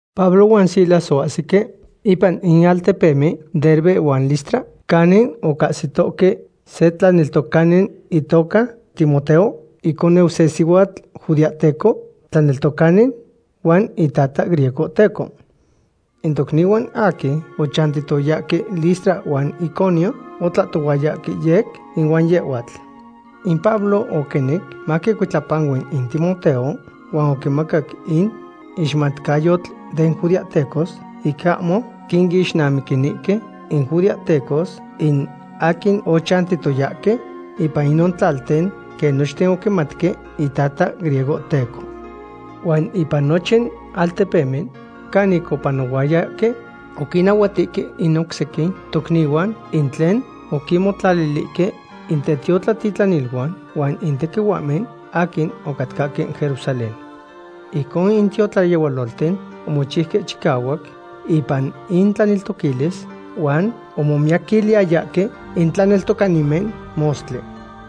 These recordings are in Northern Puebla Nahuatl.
Pablo huan Silas oahsique ipan in altepemen Derbe huan Listra, canin ocahsitohque se tlaneltocani itoca Timoteo, iconeu se sihuatl judeahteco tlaneltocani, huan in itata griegohteco. In tocnihuan aquin ochantiyayahque Listra huan Iconio otlahtohuayahque yec ihuan yehhuatl. In Pablo oquinec maquicuitlapanui in Timoteo huan oquimacac in ixmatcayotl den judeahtecos ic ahmo quinixnamiquinihque in judeahtecos in aquin ochantiyayahque ipan inon tlalten, quen nochten oquimatque itata griegohteco. Huan ipan nochin altepemen canic opanohuayahque, oquinnahuatihque in oc sequin tocnihuan in tlen oquinmotlalihque in tetiotlatitlaniluan huan in tequihuahmen aquin ocatcahque Jerusalén. Ijcon in tiotlayehualolten omochiuque chicahuac ipan intlaneltoquilis, huan omomiyaquiliyayahque in tlaneltocanimen mostli.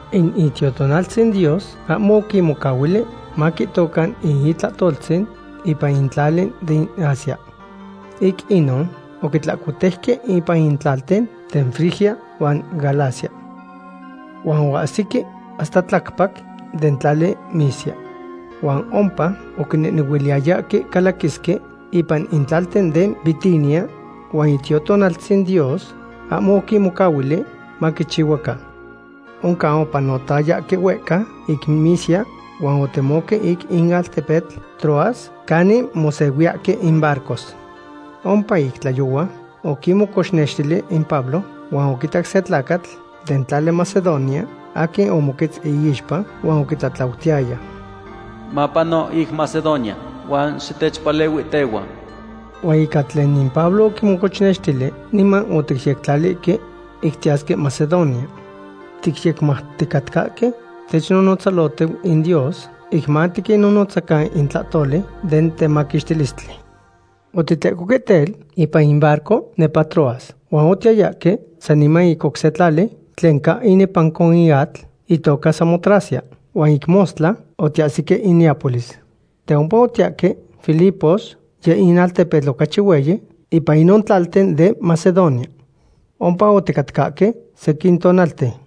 In Itiotonaltzin Dios ahmo oquinmocahuili maquihtocan in itlahtoltzin ipan in tlali den Asia. Ic inon oquitlahcotejque ipan in tlalten den Frigia huan Galacia. Huan oahsique hasta tlacpac den tlali Misia. Huan ompa oquinehnehuiliyayahque calaquisque ipan in tlalten den Bitinia, huan Itiotonaltzin Dios ahmo oquinmocahuili maquichihuacan. Oncan opanotayahque huehca ic Misia huan otemohque ic in altepetl Troas canin mosehuiyahque in barcos. Ompa ic tlayohua oquimocochnextili in Pablo, huan oquitac se tlacatl den tlali Macedonia aquin omoquetz iixpa huan oquitlatlautiyaya: “Mapano ic Macedonia huan xitechpalehuihtehua.” Huan ica tlen in Pablo oquimocochnextili, niman oticyectlalihque ic tiyasque Macedonia. Ticyecmauticatcahque technotzalohtiu in Dios ic matiquinnonotzacan in tlahtoli den temaquixtilistli. Otitlecohque tel, ipan in barco nepa Troas, huan otiyayahque saniman ic se tlali tlen ca inepanco in atl, itoca Samotracia, huan ic mostla otiahsique in Neápolis. De ompa otiyahque Filipos, yeh in altepetl ocachi hueyi ipan inon tlalten den Macedonia. Ompa oticatcahque sequin tonalten.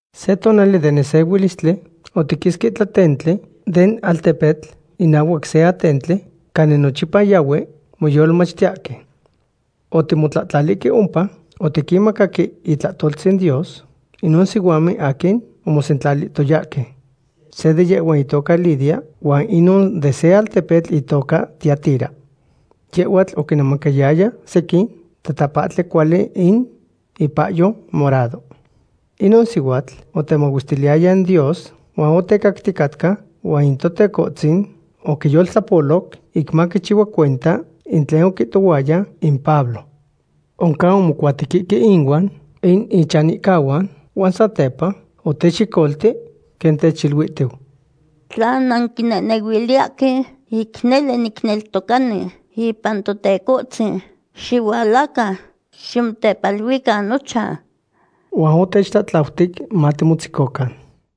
Se tonali den nesehuilistli otiquisque tlatentli den altepetl inahuac se atentli canin nochipa yahue moyolmachtiyahque. Otimotlahtlalihque ompa otiquinmacaque itlahtoltzin Dios inon sihuamen aquin omosentlalihtoyahque. Se de yehhuan itoca Lidia, huan inon de se altepetl itoca Tiatira. Yehhuatl oquinemacayaya sequin tatapahtli cuali in ipahyo morado. Inon sihuatl otemahuestiliyaya in Dios huan otecacticatca, huan in Totecohtzin oquiyoltlapoloc ic maquichihua cuenta in tlen oquihtohuaya in Pablo. Oncan omocuatequihque ihuan in ichanihcahuan huan satepa otechyecolti, quen techiluihtiu: ―Tla nanquinehnehuiliyahque ic nele nitlaneltocani ipan Totecohtzin, xihualacan ximotepaluican nochan. Huan otechtlatlautic matimotzecocan.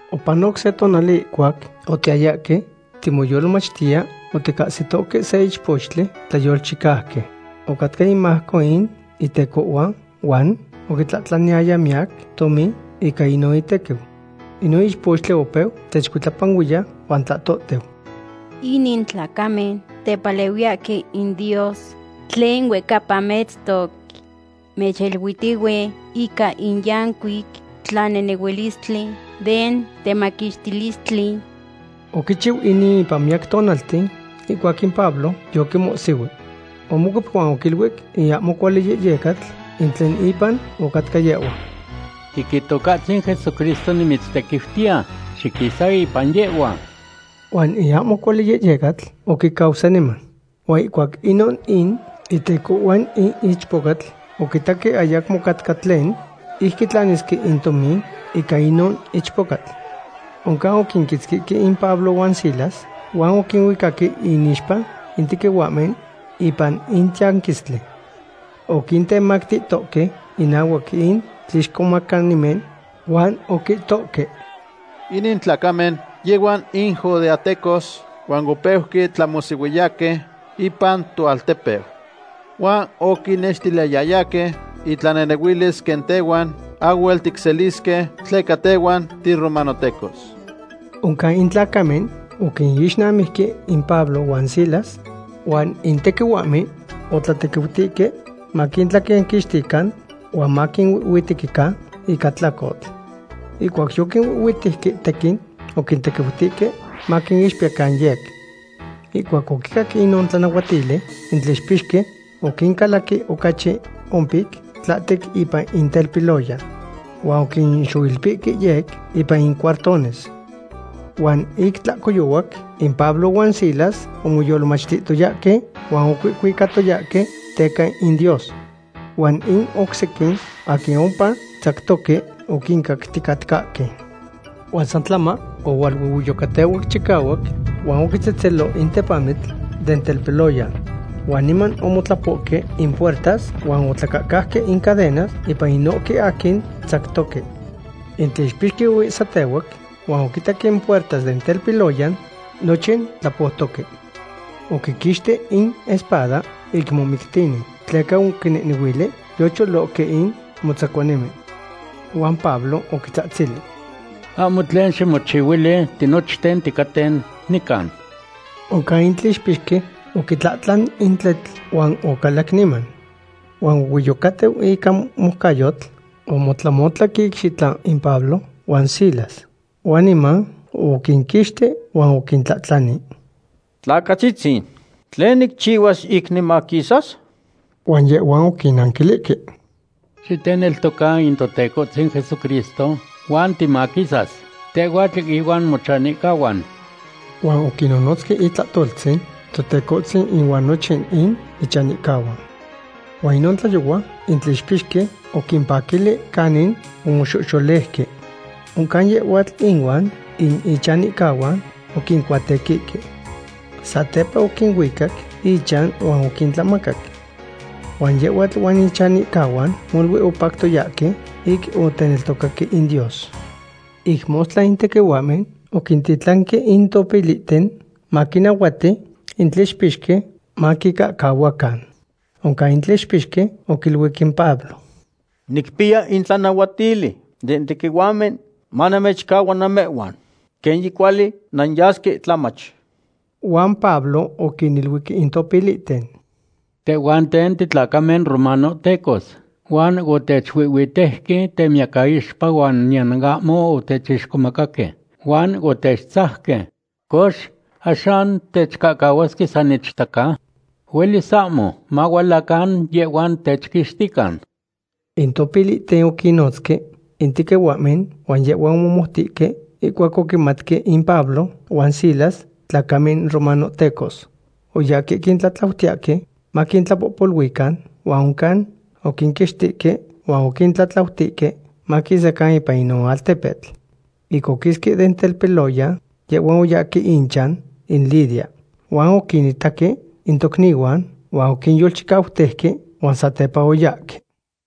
Opanoc se tonali ihcuac otiyayahque timoyolmachtiya, oticahsitohque se ichpochtli tlayolchicauqui. Ocatca inmajco in itecohhuan huan oquitlaniyaya miyac tomin ica inon itequiu. Inon ichpochtli opeu techcuitlapanuiya huan tlahtohtiu: ―Inin tlacamen tepalehuiyahque in Dios tlen huehcapa metztoc. Mechiluihtihue ica in yancuic tlanehnehuilistli den temaquixtilistli. Oquichiu inin ipan miyac tonalten, ihcuac in Pablo yoquimohsihui. Omocuep huan oquiluic in ahmo cuali yehyecatl in tlen ipan ocatca yehhua: ―Ic Itocahtzin Jesucristo nimitztequiutiya, xiquisa ipan yehhua. Huan in ahmo cuali yehyecatl oquicau saniman. Huan ihcuac inon in itecohhuan in ichpocatl oquitaque ayacmo ocatca tlen ic quitlanisque in tomin ica inon ichpocatl. Oncan oquinquitzquihque in Pablo huan Silas huan oquinuicaque inixpa in tequihuahmen ipan in tiyanquistli. Oquintemactihtohque inahuac in tlixcomacanimen huan oquihtohque: ―Inin tlacamen yehhuan in judeahtecos, huan opeuque tlamohsihuiyahque ipan toaltepeu. Huan oquinnextiliyayahque intlanehnehuilis quen tehhuan ahhuel ticselisque tleca tehhuan tiromanohtecos. Oncan in tlacamen oquinixnamijque in Pablo huan Silas, huan in tequihuahmen otlatequiutihque maquintlaquenquixtican huan maquinuihhuitequican ica tlacotl. Ihcuac yoquinuihhuitejque tequin, oquitequiutihque maquinixpiyacan yec. Ihcuac oquicac inon tlanahuatili, in tlixpixqui oquincalaqui ocachi ompic tlahtec ipan in telpiloyan. Huan oquinxoilpihque yec ipan in cuartones. Huan ic tlahcoyohuac in Pablo huan Silas omoyolmachtihtoyahque huan ocuihcuicatoyahque teca in Dios. Huan in oc sequin aquin ompa tzactoque oquincacticatcahque. Huan san tlama ohualuehueyocatehuac chicahuac huan oquitzetzelo in tepamitl den telpiloyan. Huan niman omotlapohque in puertas huan otlacahcauque in cadenas ipan inohque aquin tzactohque. In tlixpixqui oihsatehuac, huan oquitac in puertas den telpiloyan nochin tlapoutoque. Oquiquixti in espada ic momictini, tleca oquinehnehuili yocholohque in motzacuanimen. Huan Pablo oquitzahtzili: ―Ahmo tlen ximochihuili, tinochten ticaten nican. Oncan in tlixpixque oquitlahtlan in tletl, huan ocalac niman. Huan huehueyocatiu ica moucayotl, omotlamotlac icxitla in Pablo huan Silas. Huan niman oquinquixti huan oquintlahtlani: ―Tlacatzitzin, ¿tlen nicchihuas ic nimaquisas? Huan yehhuan oquinanquilihque: ―Xiteneltoca in Totecohtzin Jesucristo huan timaquisas, tehhuatl ihuan mochanihcahuan. Huan oquinnonotzque itlahtoltzin Totecohtzin inuan nochin in ichanihcahuan. Huan inon tlayohua in tlixpixqui oquimpaquili canin omoxoxoleuque. Oncan yehhuatl inuan in ichanihcahuan oquincuatequihque. Satepa oquinuicac ichan huan oquintlamacac. Huan yehhuatl huan in ichanihcahuan molui opactoyahque ic oteneltocaque in Dios. Ic mostla in tequihuahmen oquintitlanque in topilihten maquinahuati in tlixpixqui maquincahcahuacan. Oncan in tlixpixqui oquiluic in Pablo: ―Nicpiya in tlanahuatili den tequihuahmen manamechcahcahua namehhuan. Quen yicuali nanyasque tlamach. Huan Pablo oquiniluic in topilihten: ―Tehhuanten titlacamen romanohtecos, huan otechuihhuitejque temiyacaixpa huan niyan ahmo otechixcomacahque, huan otechtzajque. Cox, ¿axan techcahcahuasque san ichtacan? ¡Huelis ahmo! Mahualacan yehhuan techquixtican. In topilihten oquinnonotzque in tequihuahmen huan yehhuan omomoutihque ihcuac oquimatque in Pablo huan Silas tlacamen romanohtecos. Oyahque quintlatlautiyahque maquintlapohpoluican huan oncan oquinquixtihque huan oquintlatlautihque maquisacan ipan inon altepetl. Ic oquisque den telpiloyan, yehhuan oyahque ichan in Lidia. Huan oquinitaque in tocnihuan huan oquinyolchicautejque, huan satepa oyahque.